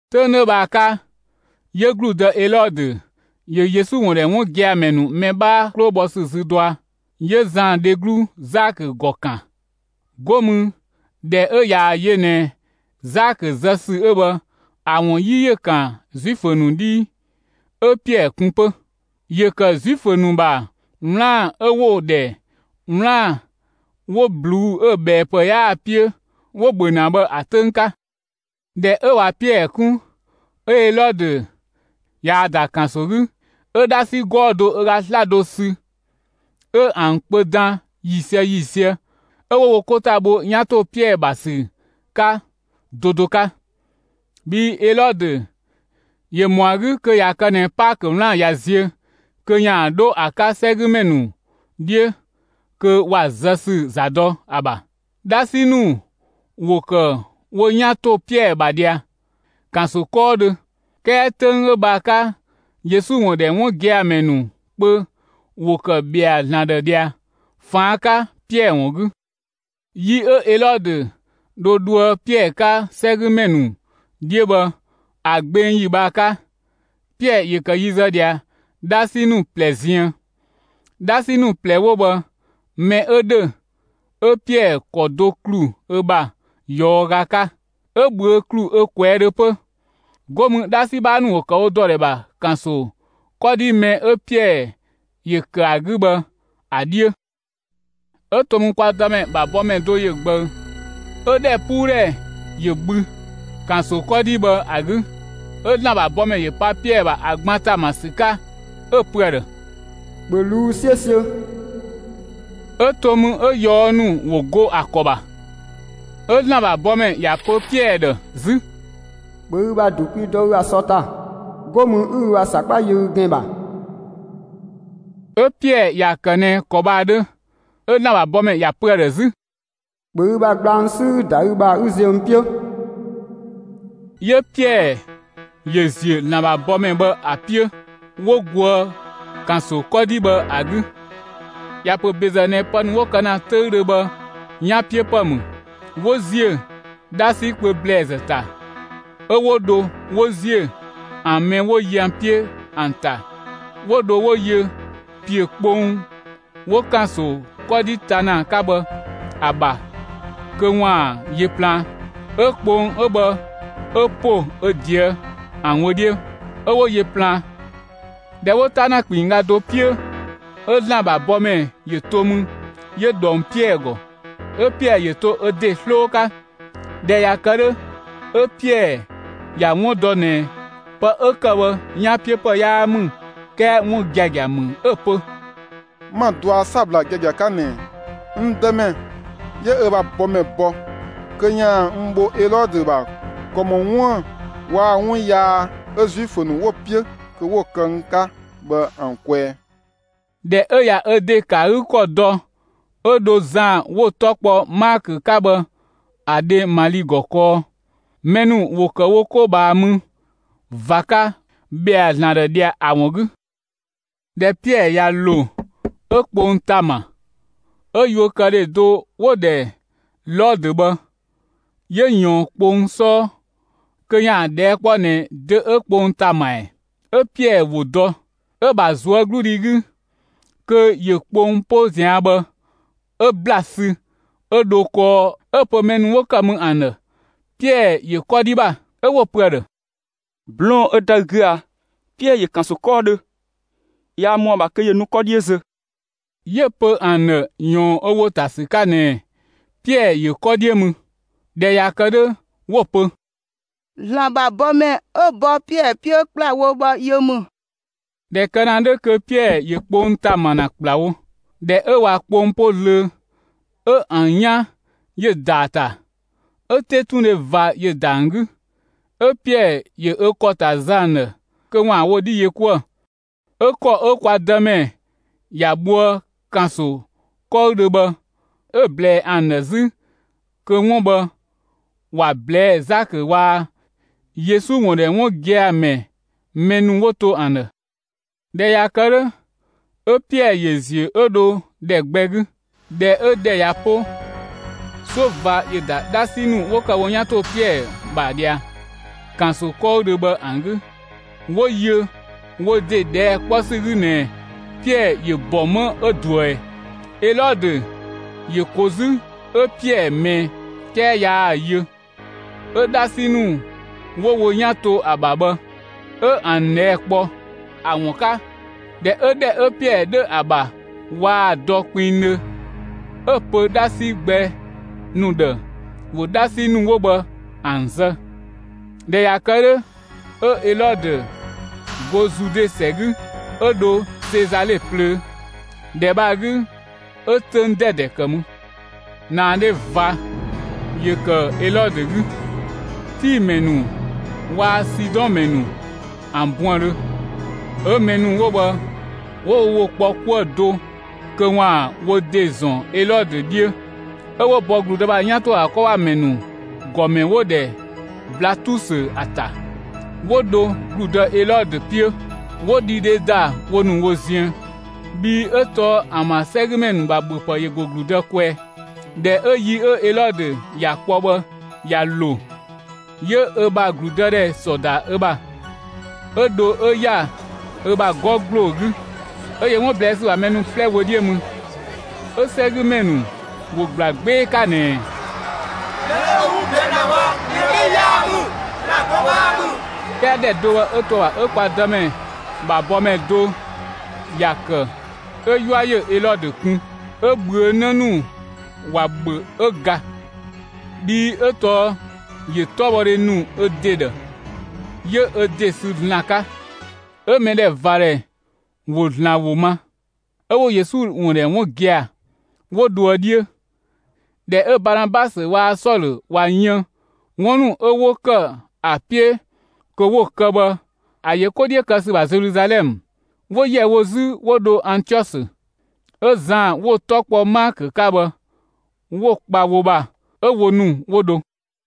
'Töng 'dhö bhë ‑a 'ka, 'yö ‑gludë Elɔdö ‑yö Yesu ‑wun ‑dhɛ 'wun gia‑ ‑mɛ ‑nu mɛ 'bhaa ‑nu 'klo bhɔ ‑sü zü dɔa. 'Yö Zan dheglu Zakö ‑gɔ ‑kan. 'Go mü ꞊dhɛ 'ö ꞊yaa‑ yö ꞊nɛ Zakö zë ‑sü 'ö bhë ‑a ‑wun 'yi ‑yö ‑kan Zuifö ‑nu 'dhii, 'ö Piɛɛ kun 'pö. (‑Yö ‑kë Zuifö ‑nu ‑bha 'wlaan‑ 'ö 'wo‑ ‑dhɛ 'wlaan‑ 'wo ꞊bluu'‑ 'ö‑ ꞊bhɛɛpë 'yaa‑ 'piö 'wo‑ ‑bhö ‑na bhë ‑a 'töng 'ka.) ꞊Dhɛ 'ö ꞊wa Piɛɛ 'kun, 'ö Elɔdö ꞊yaa‑ ‑da ‑kanso 'gü, 'ö 'dhasi 'gɔɔ‑ do ö ga 'slado sü 'ö ‑an kpö dan ‑yiisië ‑yiisië 'ö 'wo wo 'ko ‑ta bho 'yan ‑to Piɛɛ ‑bha ‑sü 'ka do do 'ka. Bhii Elɔdö ‑yö ‑mɔa 'gü kö ꞊ya kë ꞊nɛ Paakö 'wlaan‑ ꞊ya zië kö ‑yaan 'dho ‑a 'ka 'sɛgümɛ ‑nu 'dhiö kö ‑wa zë ‑sü ‑za dɔ ‑a ‑bha. 'Dhasi ‑nu ‑wo ‑kë wo 'yan ‑to Piɛɛ ‑bha ꞊dhia, ‑kanso 'kɔɔdhö, 'kɛɛ 'töng 'ö bhë ‑a 'ka, Yesu ‑wun ‑dhɛ 'wun gia‑ ‑mɛ ‑nu kpö ‑wo ‑kë ‑bhɛa ‑Zlan ‑dhë ꞊dhia ꞊faan' 'ka Piɛɛ ‑wun 'gü. Yi 'ö Elɔdö dho dhoë Piɛɛ 'ka 'sɛgümɛ ‑nu 'dhiö bhë ‑a gbeng ‑yi bhë ‑a 'ka, Piɛɛ ‑yö ‑kë yi zë ꞊dhia 'dhasi ‑nu ꞊plɛ ziën. 'Dhasi ‑nu ꞊plɛ 'wo bhë, mɛ 'ö ‑dhö 'ö Piɛɛ ‑kɔ do ‑klu ö ‑bha ꞊yɔɔga 'ka, 'ö‑ ꞊bhüö' ‑klu ö ꞊kwɛɛ' dhö 'pö. 'Go mü 'dhasi 'bhaa ‑nu ‑wo ‑kë wo ‑dɔ ‑dhɛ ‑bha ‑kanso 'kɔdhi mɛ 'ö Piɛɛ ‑yö ‑kë ‑a 'gü bhë ‑a 'dhiö. 'Ö to mü, kwa Dëmɛ ‑bha bɔmɛ do ‑yö ꞊gbëü, 'ö ‑dhɛpuudhɛ ‑yö bhü, ‑kanso 'kɔdhi bhë ‑a 'gü. 'Ö ‑Zlan ‑bha bɔmɛ ‑yö pa Piɛɛ ‑bha ‑a gban ‑ta ‑ma ‑sü 'ka 'ö‑ pö ‑a ‑dhë: «‑Bhö ꞊luu'‑ 'siösiö!» 'Ö to mü, 'ö ꞊yɔɔ' ‑nu ‑wo go ‑a ‑kɔ ‑bha. 'Ö ‑Zlan ‑bha bɔmɛ ‑ya pö Piɛɛ ‑dhë 'zü: «‑Bhö ü ‑bha ‑du kwi dɔ ü ‑bha sɔ ‑ta, 'go mü 'ü ü ‑bha ‑sakpa yö ü ‑gɛn ‑bha!» 'Ö Piɛɛ ‑ya ‑kë ꞊nɛ ‑kɔ bhë ‑a 'dhö. 'Ö ‑Zlan ‑bha bɔmɛ ‑ya pö ‑a ‑dhë 'zü: «‑Bhö ü ‑bha gblang 'sü 'ü‑ ‑da ü ‑bha 'ü ziö n 'piö!» 'Yö Piɛɛ ‑yö ‑ziö ‑Zlan ‑bha bɔmɛ bhë ‑a 'piö, 'wo goë ‑kanso 'kɔdhi bhë ‑a 'gü; ‑ya ‑pö ‑bezë ꞊nɛ pë ‑nu 'wo kë ‑na 'töüdhö bhë 'yanpiöpë ‑mü. 'Wo ‑ziö 'dhasi kpö ‑blɛɛzë ‑ta, 'ö 'wo dho 'wo ziö ‑an mɛ 'wo yö ‑an 'piö ‑an ‑ta, 'wo dho 'wo yö ‑piö kpong 'wo ‑kanso 'kɔdhi ta ‑na ‑a 'ka bhë ‑a ‑bha kö ‑waan yö plaan. 'Ö kpong 'ö bhë 'ö ‑po ö ꞊deë' ‑an wö 'dhiö, 'ö 'wo yö plaan. ꞊Dhɛ 'wo 'ta ‑na ‑kpinngga do 'piö, 'ö ‑Zlan ‑bha bɔmɛ ‑yö to mü 'yö ꞊dhong Piɛɛ ‑gɔ. 'Ö Piɛɛ ‑yö to ö ‑de 'sloo 'ka. ꞊Dhɛ ꞊ya kë 'dhö, 'ö Piɛɛ ‑ya 'wun dɔ ꞊nɛ, pë 'ö ‑kë bhë 'yanpiöpë 'yaa ‑mü, 'kɛɛ 'wun giagia ‑mü, 'ö‑ pö: «'Ma‑ dɔa 'sabla giagia 'ka ꞊nɛ, n Dëmɛ 'yö ö ‑bha bɔmɛ bɔ kö ‑yaan n bho Elɔdö ‑bha ‑kɔ ‑mɔ 'wuën‑ waa‑ 'wun yaa 'ö Zuifö ‑nu 'wo‑ 'piö kö 'wo‑ kë n 'ka bhë ‑an kwɛɛ.» ꞊Dhɛ 'ö ꞊ya ö ‑de ‑kë ‑a 'gü ‑kɔ dɔ 'ö dho Zan 'wo‑ 'tɔ kpɔ Maakö 'ka bhë ‑a dhe Mali ‑gɔ kɔɔ. Mɛ ‑nu ‑wo ‑kë wo 'ko ꞊bhaa mü ꞊va 'ka ‑bhɛa ‑Zlan ‑dhë ꞊dhia, ‑a ‑wun 'gü. ꞊Dhɛ Piɛɛ ꞊ya ‑lo, 'ö kpong ‑ta ‑ma; 'ö yuökëdhe do 'wo‑ ‑dhɛ Lɔdö bhë, 'yö ꞊yɔɔn kpong 'sɔɔ kö 'yaan‑ ꞊dhɛɛ' 'kpɔ ꞊nɛ dö 'ö kpong ‑ta ‑ma ‑ɛ? 'Ö Piɛɛ ‑wo dɔ, 'ö‑ ‑bha ꞊zuögludhi 'gü, kö ‑yö kpong 'po ꞊zian' bhë 'ö ‑bla sü 'ö dho kɔɔ 'ö‑ pö mɛ ‑nu 'wo ‑kë mü ‑an ‑dhë Piɛɛ ‑yö 'kɔdhi ‑bha. 'Ö 'wo‑ pö ‑a ‑dhë: «'Blɔɔn‑ 'ö ‑da ü 'gü a? Piɛɛ ‑yö ‑kanso 'kɔɔdhö, yaa ‑mɔa ‑bha kö ‑yö nu 'kɔdhi zö!» 'Yö‑ pö ‑an ‑dhë ‑yɔɔn ö ‑wo ‑ta ‑sü 'ka ꞊nɛ Piɛɛ ‑yö 'kɔ 'dhiö mü. ꞊Dhɛ ꞊ya kë 'dhö 'wo‑ pö: «‑Zlan ‑bha bɔmɛ 'ö bɔ Piɛɛ 'piö ‑kplawo bhë yö ‑mü.» ꞊Dhɛ kë ‑na 'dhö kö Piɛɛ ‑yö kpong ‑ta ‑ma ‑na ‑kplawo. ꞊Dhɛ 'ö ꞊wa kpong 'po zlöö, 'ö ‑an 'yan ‑yö ‑da ‑a ‑ta, 'ö 'tetundhe ꞊va ‑yö ‑da ‑an 'gü. 'Ö Piɛɛ ‑yö ö ‑kɔ ‑ta zë ‑an ‑dhë kö ‑waan wo 'dhi yö 'kuë‑. 'Ö ‑kɔ 'ö kwa Dëmɛ ‑ya bhoë ‑kanso 'kɔɔdhö bhë 'ö‑ ꞊blɛɛ ‑an ‑dhë 'zü kö 'wun bhë, ‑wa ꞊blɛɛ'‑ Zakö waa‑ Yesu ‑wun ‑dhɛ 'wun gia‑ ‑mɛ mɛ ‑nu 'wo to ‑an ‑dhë. ꞊Dhɛ ꞊ya kë 'dhö, 'ö Piɛɛ ‑yö ‑ziö 'ö dho ‑dhɛ gbɛ 'gü. ꞊Dhɛ 'ö‑ ‑dhɛ ꞊ya 'po, 'suö ꞊va ‑yö ‑da 'dhasi ‑nu 'wo ‑kë wo 'yan ‑to Piɛɛ ‑bha ꞊dhia, ‑kanso 'kɔɔdhö bhë ‑an 'gü, 'wo yö wo ‑de ꞊dhɛɛ' 'kpɔ ‑sü 'gü ꞊nɛ Piɛɛ ‑yö ‑bɔ 'më 'ö ꞊duë ꞊ɛ? Elɔdö ‑yö ‑ko 'zü 'ö Piɛɛ ꞊mɛɛ, 'kɛɛ yaa‑ yö. 'dhasi ‑nu 'wo wo 'yan to ‑a ‑bha bhë, 'ö ‑an ꞊dhɛɛ' kpɔ ‑a ‑wun 'ka. ꞊Dhɛ 'ö ‑dhɛ 'ö Piɛɛ 'dhö ‑a ‑bha waa‑ dɔ kpinngdhö, 'ö‑ pö 'dhasi gbɛ ‑nu ‑dhë ‑wo 'dhasi ‑nu 'wo bhë ‑an zë. ꞊Dhɛ ꞊ya kë 'dhö, 'ö Elɔdö go Zude ‑sɛ 'gü, 'ö dho Sezale plöö. ‑Dhɛ bhë ‑a 'gü 'ö 'töng 'dɛdɛ ‑kë mü. ‑Naadhe ꞊va ‑yö ‑kë Elɔdö 'gü, Tii ‑mɛ ‑nu waa‑ Sidɔn ‑mɛ ‑nu ‑an buëndhö. 'Ö mɛ ‑nu 'wo bhë 'wo wo ‑wo kpɔ 'kuë‑ do kö 'waan‑ wo ‑de ‑zɔn Elɔdö 'dhiö, 'ö 'wo bɔ ‑gludë ‑bha 'yan ‑to ‑a ‑bha 'kɔ ‑bha ‑mɛ ‑nu ‑gɔmɛ 'wo‑ ‑dhɛ Blatusö ‑a ‑ta, 'wo dho ‑gludë Elɔdö 'piö, 'wo dhidhe ‑da wo ‑nu wo ziën. Bhii 'ö tɔɔ ‑an ‑bha 'sɛgümɛ ‑nu ‑bha ‑bhöpë ‑yö ‑go ‑gludë kwɛɛ. ꞊Dhɛ 'ö yi 'ö Elɔdö ‑ya kpɔ bhë ꞊ya ‑lo, 'yö ö ‑bha ‑gludëdhɛ ‑sɔ ‑da ö ‑bha, 'ö dho 'ö ‑ya ö ‑bha 'gɔ ‑gbloo 'gü, 'ö yö 'wun ꞊blɛɛ' ‑sü ‑bha mɛ ‑nu 'plɛ wö 'dhiö mü. 'Ö 'sɛgümɛ ‑nu ‑wo ‑gbla 'gbee‑ 'ka ꞊nɛɛ: «Mɛ 'ö 'wun ꞊blɛɛ' ‑na bhë, mɛ 'bhee‑ 'yaa ‑mü, ‑zlan do 'bhaa ‑mü!» 'Kɛɛ ‑dhɛ do bhë 'ö to ‑a ‑bha 'ö kwa Dëmɛ ‑bha bɔmɛ do ‑ya ‑kë 'ö 'yua ‑yö Elɔdö kun, 'ö ꞊bhüö' 'në ‑nu ‑wa ‑bhö 'ö ga. Bhii 'ö tɔɔ ‑yö 'tɔbhɔdhe ‑nu ö ‑de ‑dhë, 'yö ö ‑de sü ‑Zlan 'ka. 'Ö mɛdhɛvadhɛ ‑wo ‑Zlan ‑wo ma, 'ö 'wo Yesu ‑wun ‑dhɛ 'wun gia‑, 'wo dhoë 'dhiö. ꞊Dhɛ 'ö Baanabasö waa‑ Sɔlö ꞊wa yën 'wun ‑nu 'ö 'wo ‑kë ‑a 'piö kö 'wo‑ kë bhë ‑a ‑yö 'ko 'dhiö kë ‑sü ‑bha Zeluzalɛmë, 'wo ‑yɛ wo 'zü 'wo dho Antiɔsö. 'Ö Zan 'wo‑ 'tɔ kpɔ Maakö 'ka bhë, 'wo‑ kpa wo ‑bha 'ö wo ‑nu 'wo dho.